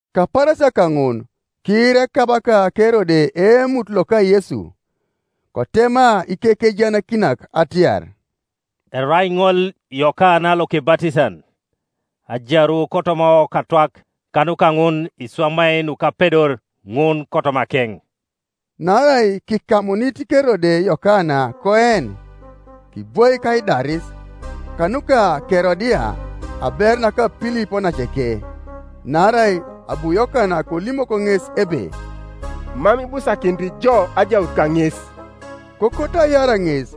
Kapaarasia kaŋun kiira ekabaka Kerode eemut loka Yesu; Kotema ikekejaanakinak atiar, “Erai ŋol Yokana Lokebatisan, ajaru kotoma okatwak; kanuka ŋun iswamai nukapedor ŋun kotomakeŋ.” Naarai kikamunit Kerode Yokana koen, kibwaik aidaris, kanuka Kerodia aberu naka Pilip onaceke. Naarai abu Yokana kolimok ŋes ebe, “Mam ibusakinit jo ajaut kaŋes.” Kokoto aiar ŋes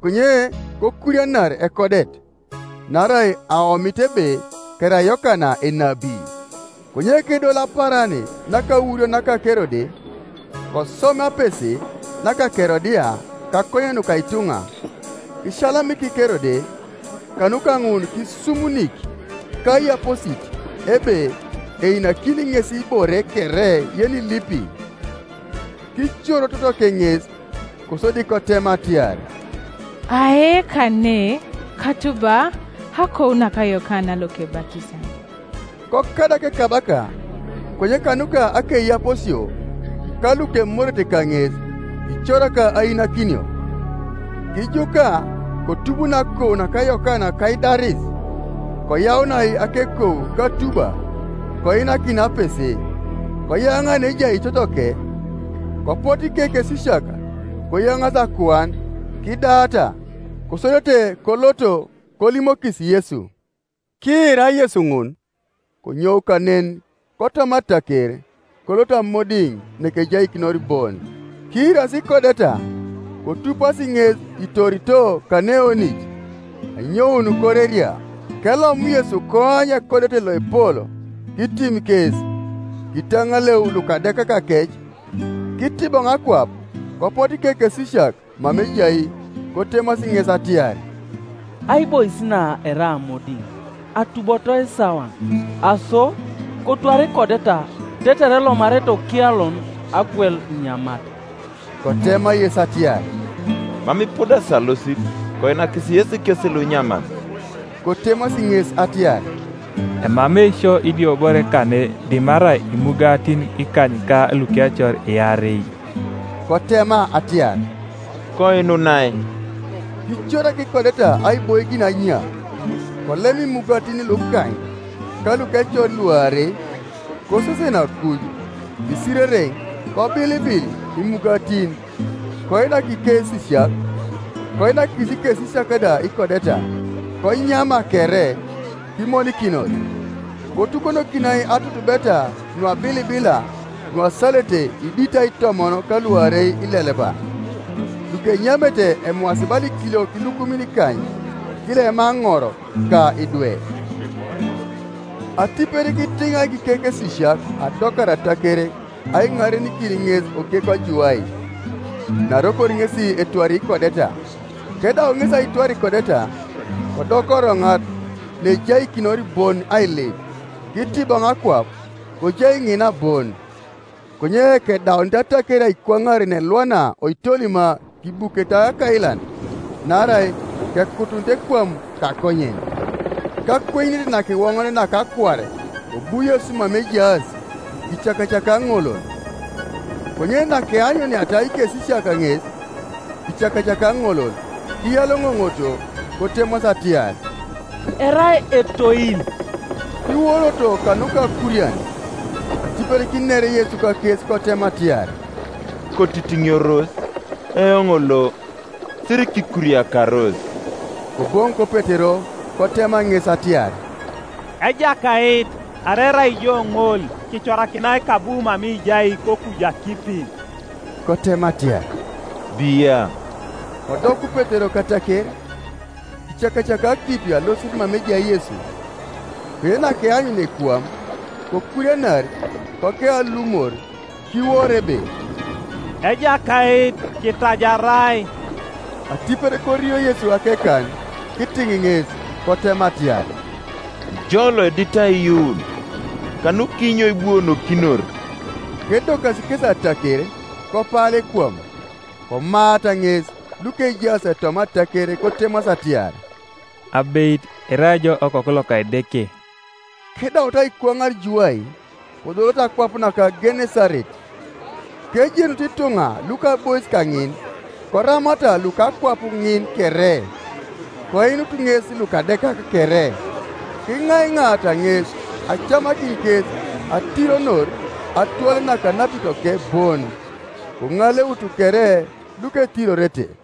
konye kokurianar ekodet, naarai aomito ebe kerai Yokana enabi. Konye kedol apaaran nakaurio naka Kerode, kosom apese naka Kerodia kakonyen nuka ituŋa, kisiyalamik Kerode, kanuka ŋun kisumunik kaiyaposit ebe einakini ŋes ibore kere yenilipi. Kicoro totoke ŋes, kosodi kotema atiar, “Ae kane katuba akou naka Yokana Lokebatisan.” Kokadak ekabaka; konye kanuka akeiyaposio ka lukemorete kaŋes kicorak ainakinio. Kijuka kotubunoi akou naka Yokana kaidaris, koyaunai akekou katuba koinakinai apese, koyaŋa neejai totoke, Kopotu ikekesisiak koyaŋaasi akuan, kidaata; kosodete koloto kolimokis Yesu. Kiira Yesu ŋun, konyou kanen kotoma ataker, kolot amodiŋ neejaikinor bon, Kiirasi ikodeta, kotupasi ŋes itorito kaneeoŋit anyoun koreria. Kelom Yesu koany ekodet loepol; kitim kes, kitaŋaleu lukadekakakec. Kitiboŋ akwap, kopotu ikekesisiak mama ejai, kotemasi ŋes atiar, “Aibois na erai amodiŋ, atuboto isawan; aso, kotwar ikodeta tetere elomanarete okialon agwel inyamat.” Kotema Yesu atiar, “Mam ipudasi alosit; koinakis yesi kes lunyaman.” Kotemasi ŋes atiar, “Emamei sio idiobore kane dimarai imugatin ikany ka lukecor iarei.” Kotema atiar, “Koinunai.” Kicorak ikodeta aiboikin anya; kolem imugatin lukany, ka lukecor luarei, kosesen akuj, kisirereŋ, kobilibil imugatin, koinak ikesisiak, koinakis ikesisiak da ikodeta. Konyama kere kimonikinos. Kotukonokinai atutubeta nuabilibila nuasalete iditai itomon ka luarei ileleba. Lukenyamete emwaasi bala ikiliok ilukumin ikany, kilema aŋor ka idwe. Atipet kitiŋaik ikekesisiak adokar ataker aiŋarenikin ŋes okekwa juwai, naarokor ŋesi etwari ikodeta. Kedau ŋesi aitwar ikodeta, kodoka oroŋat neejaikinor bon ailip. Kitiboŋ akwap, kojai ŋina bon. Konye kedaunit ataker aikwaŋar neelwana koitolima kibukete akailan; naarai kekutunit ekwam kakonyen, Kakwenyunet nakiwoŋonet naka akuar kobu Yesu mama ejaas, kicakacakai aŋolol. Konye nakeanyuniata ikesisiak ŋes icakacakai aŋolol, kiyaloŋoŋoto, kotemasi atiar, “Erai etoil” Kiworoto kanuka akurian. Atipet kiner Yesu kakes kotema atiar, “Kotitiŋioros! Eoŋ lo, sirikikuriakaros.” Koboŋok Petero kotema ŋes atiar, “Ejakait, arai erai jo ŋol, kicorakinai kabu mama ijai kokuju akipi.” Kotema atiar, “Bia,” Kodoku Petero kataker, kicakacakai akipi alosit mama ejai Yesu. Konye nakeanyunia ekwam, kokurianar, kogeu alumor, kiworo ebe, “Ejakait, kitajarai.” Atipet korio Yesu akekan kitiŋ ŋes, kotema atiar, “Ijo loedit aiyuun, kanukinyo ibuonokinor?” Kedokasi kesi ataker kopala ekwam. Komaata ŋes lukejaas toma ataker kotemasi atiar, “Abeit irai ijo Okoku loka Edeke.” Kedaut aikwaŋar juwai, kodoloto akwap naka Genesaret. Kejenut ituŋa luka aibois kaŋin, koramata luka akwap ŋin kere, koinut ŋes lukadekak kere. Kiŋaiŋaata ŋes acamakin kes atironor atwele naka anapitoke bon; koŋaleutu kere luketirorete.